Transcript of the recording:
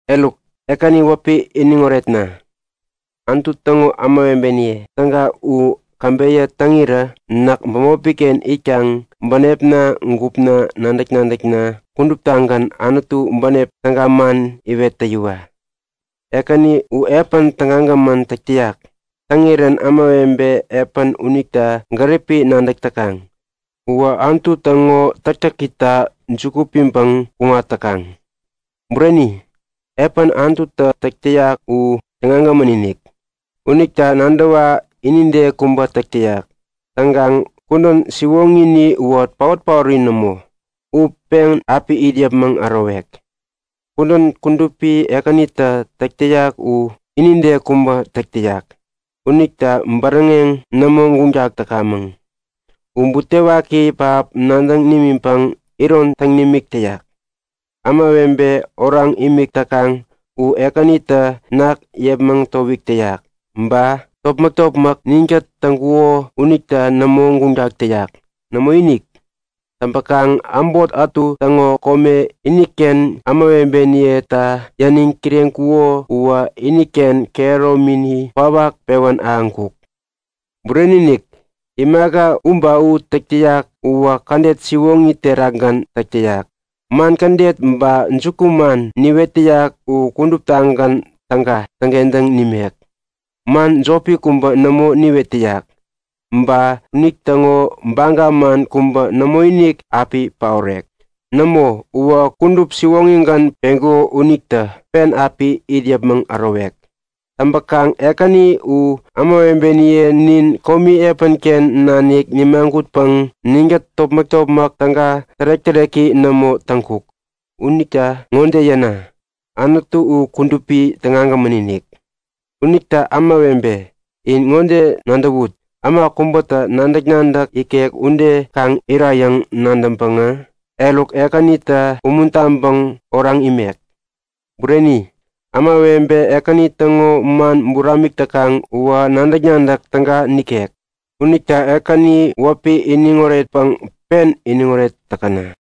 Eruk, Ekäni wäpi iniŋ oretna! Anutu täŋo ämawebeniye täga u käbeyä täŋirä näk bämopiken itkaŋ bänepna gupna nadäk-nadäkna kuduptagän Anutu bänep täga man iwet täyiwa! Ekäni u epän tägagämän täk täyak. Täŋirän ämawebe epäni unita gäripi nadäk täkaŋ uwä Anutu täŋo täktäkita juku piŋtäŋ kuŋat täkaŋ. Bureni-inik! Epän Anututä täk täyak u tägagämän-inik. Unita nadäwa inide kubä täk täyak. Täŋkaŋ kudän siwoŋini uwä paot-paori nämo. U pen api it yäpmäŋ ärowek. Kudän kudupi Ekänitä täk täyak u inide kubä täk täyak. Unita bäräŋeŋ nämo guŋtak täkamäŋ. U butewaki pähap nadäŋ nimiŋpäŋ iron täŋ nimik täyak. Ämawebe oraŋ imik täkaŋ u Ekänitä ketem yepmäŋ towik täyak. Ba topmäk-topmäk ninkät täŋkuko unita nämo guŋtak täyak. Nämoinik! Täŋpäkaŋ äbot ätu täŋo kome, iniken ämawebeniyeta yäniŋ kireŋkuko uwä iniken kehäromini kwawak pewän ahäŋkuk. Bureni-inik! Imaka u ba u täk täyak uwä kädet siwoŋi terakgän täk täyak. Man kädet ba jukuman niwet täyak u kuduptagän täga täŋkentäŋ nimek. Man jopi kubä nämo niwet täyak! Ba unitäŋo baga man kubä nämoinik api paorek. Nämo, uwä kudup siwoŋigän peŋkuko unitä pen api it yäpmäŋ ärowek. Täŋpäkaŋ Ekäni u ämawebeniye nin komi epänken nanik nimagutpäŋ ninkät topmäk-topmäk täga, tärek-täreki nämo täŋkuk. Unita ŋode yäna; Anutu u kudupi, tägagämän-inik. Unita ämawebe, in ŋode nadäwut; Äma kubä nadäk-nadäk ikek ude kaŋ irayäŋ nadäŋpäŋä, eruk, Ekänita umuntaŋpäŋ oraŋ imek. Bureni, ämawebe Ekäni täŋo man buramik täkaŋ uwä nadäk-nadäk täga nikek. Unita Ekäni wäpi iniŋ oretpäŋ pen iniŋoret täkäna!